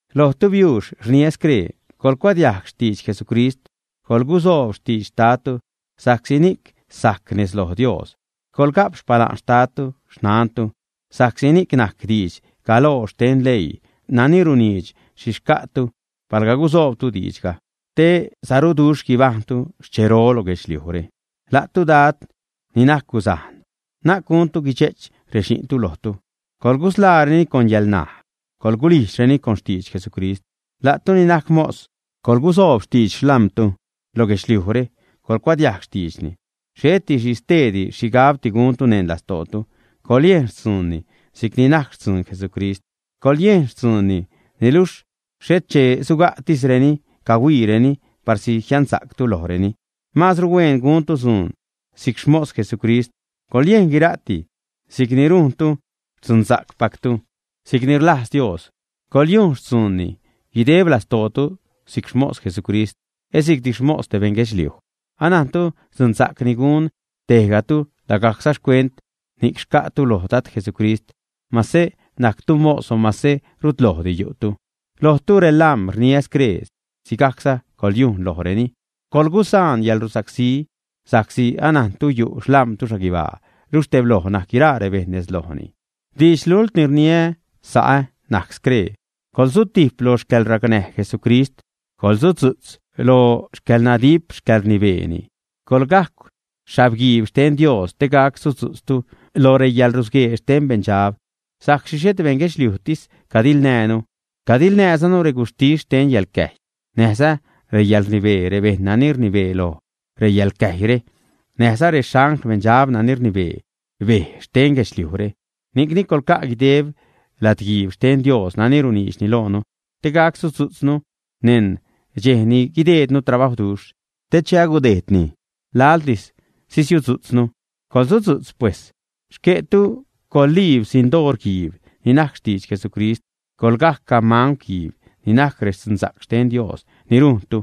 Lojtu biuux, rniä scree: Coḻgucuadiajg xtidx Jesucrist, colgusoob xtidx xtadtu sa'csi ni'c sajc nez loj Dios. Coḻga'p xpala'n xtadtu, xnantu, sa'csi ni'c najc didx galoo xten leii nani runiidx xhi xca'tu palga gusoobtu diidxga; “Te saruduxh guibajṉtu xchero lo guedxliujre.” La'tu, Dad ni najc guzajn, na'c guntu guidxe'ch rexi'ntu lojtu. Coḻgusḻaareni con yäḻnaj, coḻgulijdxreni con xtidx Jesucrist. La'tu ni najc mos, coḻgusoob xtidx xlam̲tu lo guedxliujre, coḻcuadiajg xtiidxni, xhet xhi steedi xhigabdi guntu neṉ lastootu. Coḻyejn xtzuunni si'cni najc xtzuun Jesucrist. Coḻyejn xtzuunni, niluxh xhet che suga'tisreni, cahuiireni, parsi jiansa'ctu lojreni. Maazru hueen guntu dzuun si'c xmos Jesucrist; coḻyejn guira'ti si'cni rujntu xtzuunpactu; si'cni rlajz Dios. Coḻyujn xtzuunni guideb lastootu si'c xmos Jesucrist, et si'cdi xmos beṉ guedxliuj. Anajntu dzunsa'c ni gun tejgatu, lagajcza xcuent ni'c xca'tu loj Dad Jesucrist, mase najctu mos o mase rutlojdi yu'tu. Lojtu, relam̲, rniä scree: Sigajcza coḻyujn lojreni. Coḻgusaan yäḻrusacsí, sa'csi anajntu yu' xlam̲tu xhaguibaa, luxh tebloj najc guiraa rebejṉ nez lojni. Didx lult ni rniä, sa'ä, najc scree: Coḻsutijp lo xcäḻracnäj Jesucrist, coḻsudzu'tz lo xcäḻnadip xcäḻrnibeeni. Coḻgajcw xhabguiib xten Dios te gac sudzu'tztu lo reyäḻrusguee xten beṉdxab. Sa'csi xhet beṉ guedxliujtis cadiḻnäjnu. Cadiḻnäjzanu reguxhtis xte yäḻcäjy, näjza reyäḻrnibee, rebejṉ nani rnibee loj reyäḻcäjyre, näjza rexangl beṉdxab nani rnibee bej xten guedxliujre. Ni'cni coḻca' guideb lad-guiib xten Dios nani runiidxni loonu te gac sudzu'tznu neṉ dxej ni guideednu trabajwduxh, te che agudejdni, laḻtis sisiudzu'tznu. Coḻsudzu'tz pues. Xque'tu coḻguliib sindoor-guiib ni najc xtidx Jesucrist, coḻgajcw gamangw-guiib ni najc rextzunsa'c xten Dios ni rujntu.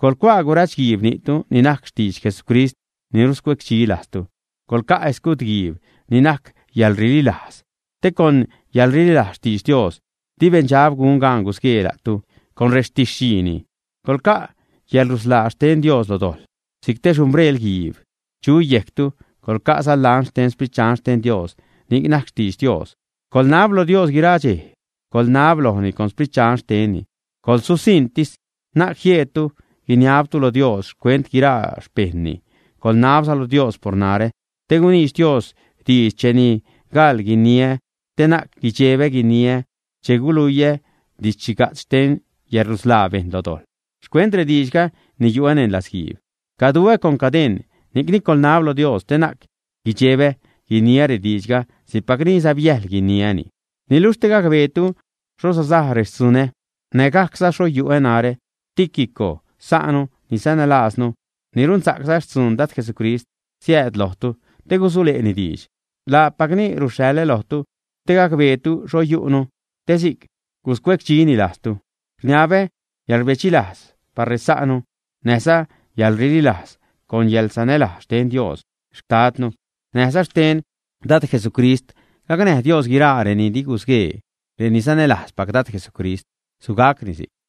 Coḻcuaa gurach-guiib ni'tu (ni'c najc xtidx Jesucrist ni ruscuecdxi lajztu). Coḻca' escud-guiib ni najc yäḻrililajz te con yäḻrililajz xtidx Dios di beṉdxab gun gaan gusguee la'tu con rextidx-xhiini. Coḻca' yäḻrusḻaa xten Dios lo dojḻ si'c te xhumbrel-guiib chu yejctu; coḻca'za lans xten Sprit Dxan xten Dios ni najc xtidx Dios. Coḻnab lo Dios guiraa dxej; coḻnab lojni con Sprit Dxan xtenni; coḻsusiṉtis; na'c jieedtu guiniabtu lo Dios xcuent guiraa xpejṉni. Coḻnabza lo Dios por narä te guniidx Dios diidx cheni gaḻ guiniä, te na'c guidxebä guiniä che guluiä didx-xhiga'tz xten yäḻrusḻaa bejṉ lo dojḻ. Xcuent rediidxga ni yu'ä neṉ latzguiib, caduä con cadeṉ. Ni'cni coḻnab lo Dios te na'c guidxebä guiniä rediidxga si'cpacni säbyäjl guiniäni. Niluxh te gacbeetu xho sasaj rextzunä, nägajcza xho yu'ä narä, Tíquico, sa'nu ni sanälajznu, ni runsa'cza xtzun Dad Jesucrist, siääd lojtu te gusule'ni diidx. Laapacni ruxhaḻä lojtu, te gacbeetu xho yu'nu, te si'c guscuecdxini lajztu. Rniabä yäḻrbedxilajz par resa'nu, näjza yäḻrililajz con yäḻsanälajz xten Dios Xtadnu näjza xten Dad Jesucrist. Gacnäj Dios guiraa reni di gusguee, reni sanälajzpac Dad Jesucrist. Sugacni si'c.